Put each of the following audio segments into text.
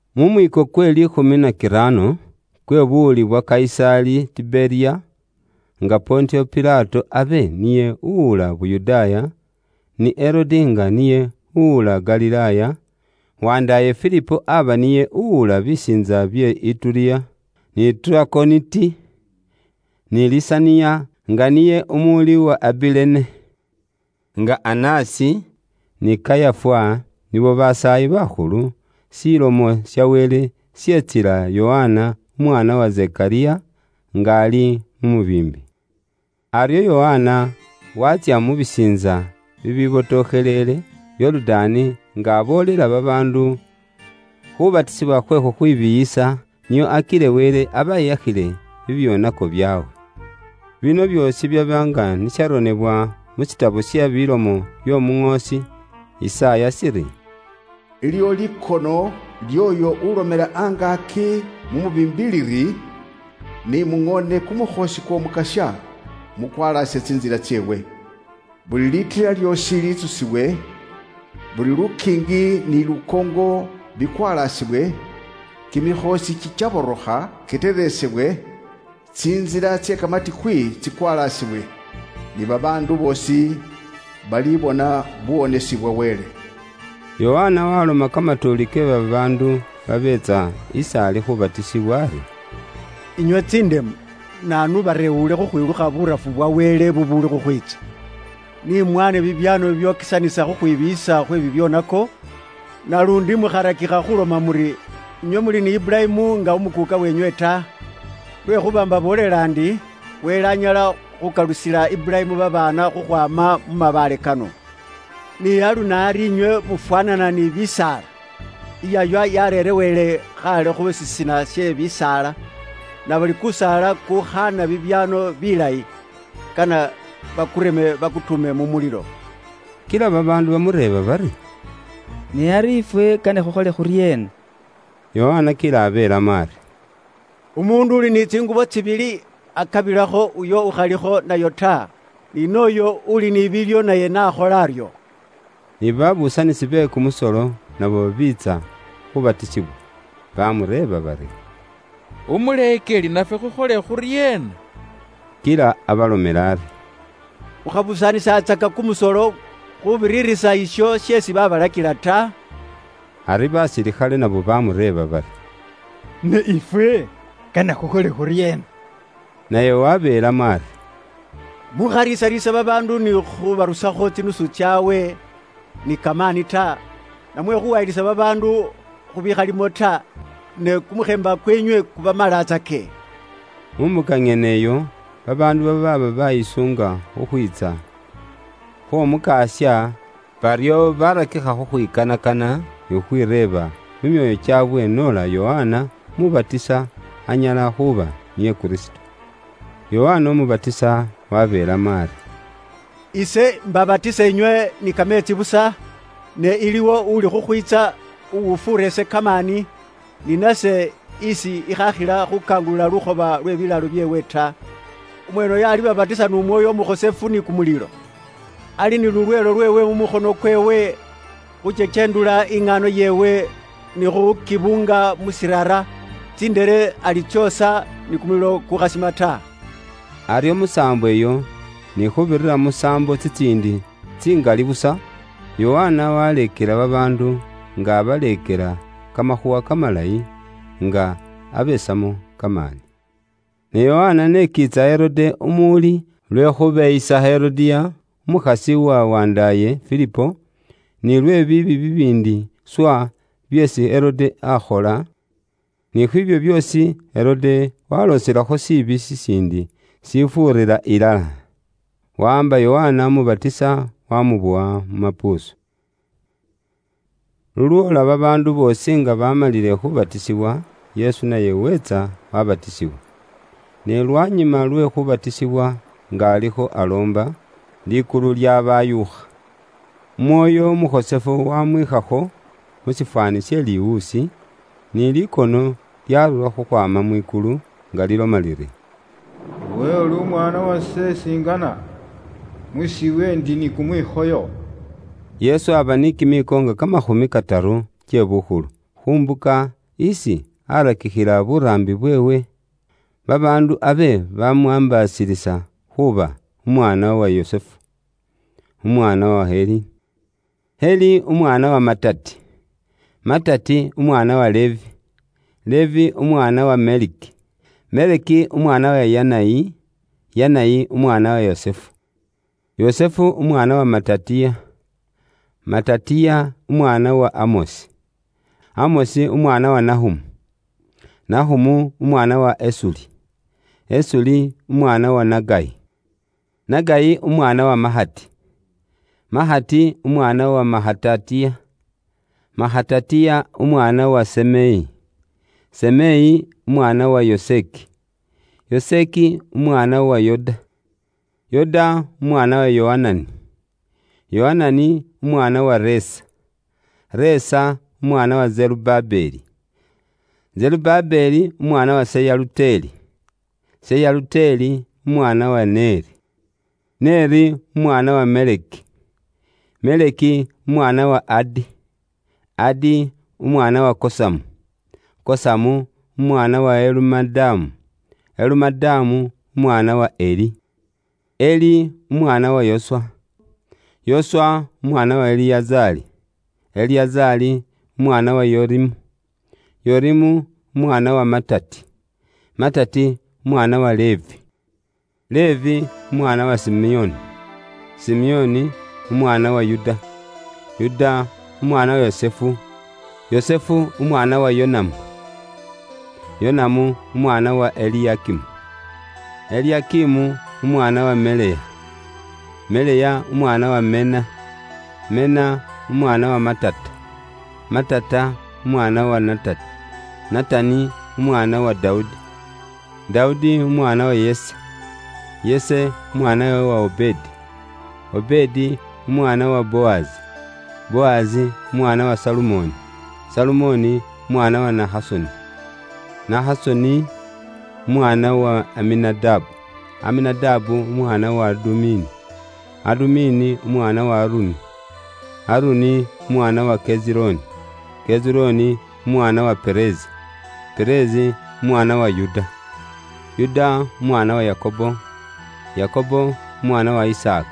Mu mwiiko kwe liikhumi na kiraano kwe buwuli bwa Kayisaali Tiberiya, nga Pontiyo Pilato abe niye uwula Yuda, ni Herode nga niye uwula Galilaaya, wandaaye Filipo aba niye uwula bisiintsa bye Ituriya ni Trakoniti; ni Lisaniya nga niye umuwuli wa Abilene, nga Anasi ni Kayafa nibo basaayi bakhulu; Ilomo ya Wele yetsila Yokana umwaana wa Zekariya, nga ali mu mubiimbi. Aryo Yokana waatsya mu bisiintsa bibibotokheleele Yorudaani, nga aboolela babaandu khu khubatisibwa khwe khukhwibiiyisa, nio akile Wele abeyakhile bibyoonako byaabwe. Bino byoosi byaba nga ni sharonebwa mu burone bw'omuŋoosi Yisaaya shiri: “Iliwo likono ly'oyo ulomela angaaki mu mubiimbi liri; ‘Ni muŋoone kumukhoosi kw'Omukasya, mukwalaase tsintsila tseewe. Buli litila lyoosi litsusiwe, buli lukiingi ni lukoongo bikwalaasibwe, kimikhoosi kikyaborokha kiteresebwe, tsintsila tse kamatikwi tsikwalasibwe. Ni babaandu boosi balibona buwonesi bwa Wele.’” Yokana waloma kamatuuli ke babaandu babeetsa is'ali khubatisibwa ari, “Inywe tsindemu, naanu ubarewuule khukhwilukha burafu bwa Wele bubuuli khukhwiitsa? Nimwane bibyaamo bibyokesanisa khukhwibiiyisa khwe bibyoonako, naluundi mukharakikha khuloma muri, inywe muli ni Iburayimu nga Umukuuka wenywe ta. Lwekhuuba imbaboolela ndi, Wele anyala khukalusila Iburayimu babaana khukhwaama mu mabaale kano. Ni alunaari inywe mufwaanana ni bisaala; iyaywa yareerewele khaale khu shisina she bisaala, nabuli kusaala kukhaana bibyaano bilayi, kane bakureme bakutuume mu mulilo.” Kila babaandu bamureeba bari, “Ne ari ifwe kane khukhole khuryeena?” Yokana kila abeelamo ari, “Umuundu uli ni tsingubo tsibili, akabilekho uyo ukhalikho nayo ta, ni nooyo uli ni biilyo naye nakhole aryo.” Ni babuusanisi be kumusolo nabo biitsa khubatisibwa. Bamureeba bari, “Umuleekeli nafwe khukhole khuryeena?” Kila abalomela ari, “Mukhabusaanisatsaka kumusolo khubiririsa isho sheesi babalakila ta.” Ari basilikhale nabo bamureeba bari, “Ne ifwe, kane khukhole khuryeena?” Naye wabeelamo ari, “Mukhariisariisa babaandu ni khubarusakho tsinusu tsaabwe ni kamaani ta, namwe khuwayilisa babaandu khubikhalimo ta, ne kumukheemba kweenywe kubamalatsake.” Mu mbuka nyene iyo, babaandu baaba bayisuunga khukhwiitsa khw'Omukasya, baryo barakikha khukhwikanakana ni khukhwireeba mu myoyo kyaabwe noola Yokana Umubatisa anyala khuuba niye Kristo. Yokana Umubatisa wabeelamo ari, “Ise mbabatisa inywe ni kameetsi busa, ne iliwo uli khukhwiitsa uwufuura ise kamaani, ni nase isi ikhaakhila khukangulula lukhoba lwe bilaalo Khuukangulula lukhoba kwabatsaka kumulimo kw'omukulwa. byeewe ta. Umweeneyo alibabatisa n'Umwoyo Umukhosefu ni kumulilo. Ali ni lulweelo lweewe mu mukhono kweewe, khu kyekyendula iŋaano yeewe ili khu lwaanyi, ni khukibuunga mu shiirara, likhuutsi alyooshe ni kumulilo kukhasima ta.” Aryo musaambo iyo, ni khuubirira musaambo tsitsiindi tsingali busa, Yokana waleekela babaandu nga abaleekela kamakhuuwa kamalayi, nga abesamo kamaani. Ne Yokana n'ekiitsa Herode Umuwuli lwe khubeyisa Herodiya umukhasi wa wandaaye Filipo, ni lwe biibi bibiindi swa byeesi Herode akhola, ni khwiibyo byoosi, Herode walooselakho shiibi shishiindi shifuurira ilala: wawaamba Yokana Umubatisa waamubowa mu mapuusu. Lulwoola babaandu boosi nga bamalile khubatisibwa, Yesu naye weetsa wabatisibwa. Ne lwanyuma lwe khubatisibwa nga alikho aloomba, likulu lyabayuukha, Umwoyo Umukhosefu wamwikhakho mu shifwaani she liwuusi, ni likono lyarura khukhwaama mwikulu nga liloma liri, “Iwe uli Umwaana wase isi ingana, musiiwe ndi ni kumwikhoyo.” Yesu aaba ni kimiiko nga kamakhumi kataru kye bukhulu, khu mbuka isi aarakikhila buraambi bweewe. Babaandu abe bamwaambaasilisa khuuba umwaana wa Yusufu, uwaba umwaana wa Heli. Heli aaba umwaana wa Matati, Matati umwaana wa Levi. Levi aaba umwaana wa Meleki, Meleki umwaana wa Yanayi. Yanayi aaba umwaana wa Yusufu, Yusufu umwaana wa Matatiya. Matatiya aaba umwaana wa Amosi, Amosi umwaana wa Nahumu. Nahumu aaba umwaana wa Esuli, Esuli umwaana wa Nagayi. Nagayi aaba umwaana wa Mahati, Mahati umwaana wa Mahatatiya. Mahatatiya aaba umwaana wa Semeyi, Semeyi umwaana wa Yoseki. Yoseki aaba umwaana wa Yoda. Yoda aaba umwaana wa Yohanani, Yohanani umwaana wa Resa, Resa umwaana wa Zerubabeli. Zerubabeli aaba umwaana wa Seyaluteli, Seyaluteli umwaana wa Neri, Neri umwaana wa Meleki, Meleki umwaana wa Adi, Adi umwaana wa Kosamu, Kosamu umwaana wa Elumadamu, Elumadamu umwaana wa Eri, Eri umwaana wa Yoswa, Yoswa umwaana wa Eliyazari, Eliyazari umwaana wa Yorimu, Yorimu umwaana wa Matati, Matati umwaana wa Levi. Levi aaba umwaana wa Simeoni, Simeoni umwaana wa Yuda, Yuda umwaana wa Yusufu, Yusufu umwaana wa Yonamu, Yonamu umwaana wa Eliyakimu, Eliyakimu umwaana wa Meleya, Meleya umwaana wa Mena, Mena umwaana wa Matata, Matata umwaana wa Natani, Natani umwaana wa Dawudi, Dawudi umwaana wa Yese, Yese umwaana wa Obedi, Obedi umwaana wa Bowazi, Bowazi umwaana wa Salumoni, Salumoni umwaana wa Nahasoni. Nahasoni aaba umwaana wa Aminadabu, Aminadabu umwaana wa Adumini, Adumini umwaana wa Aruni, Aruni umwaana wa Kezironi, Kezironi umwaana wa Perezi, Perezi umwaana wa Yuda, Yuda umwaana wa Yakobo, Yakobo umwaana wa Isaaka,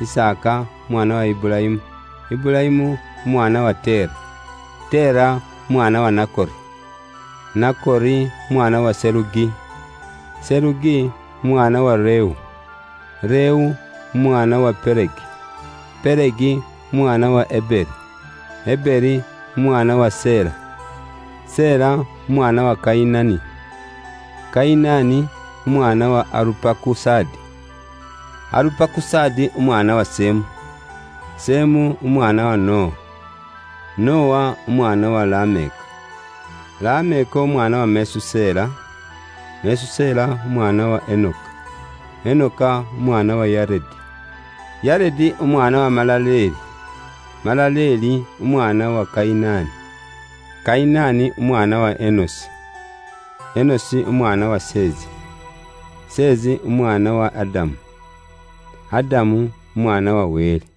Isaaka umwaana wa Iburayimu, Iburayimu umwaana wa Tera, Tera umwaana wa Nakori, Nakori umwaana wa Serugi, Serugi umwaana wa Rewu, Rewu umwaana wa Pelegi, Pelegi umwaana wa Eberi, Eberi umwaana wa Sela. Sela aaba umwaana wa Kayinani, Kayinani umwaana wa Arupakusadi, Arupakusadi Semu, Semu umwaana wa Nowa, Nowa umwaana wa Lameka, Lameka umwaana wa Mesusela, Mesusela umwaana wa Enoka, Enoka umwaana wa Yaredi, Yaredi umwaana wa Malaleli, Malaleli umwaana wa Kayinani, Kenani umwaana wa Enosi, Enosi umwaana wa Seezi, Seezi umwaana wa Adamu, Adamu umwaana wa Wele.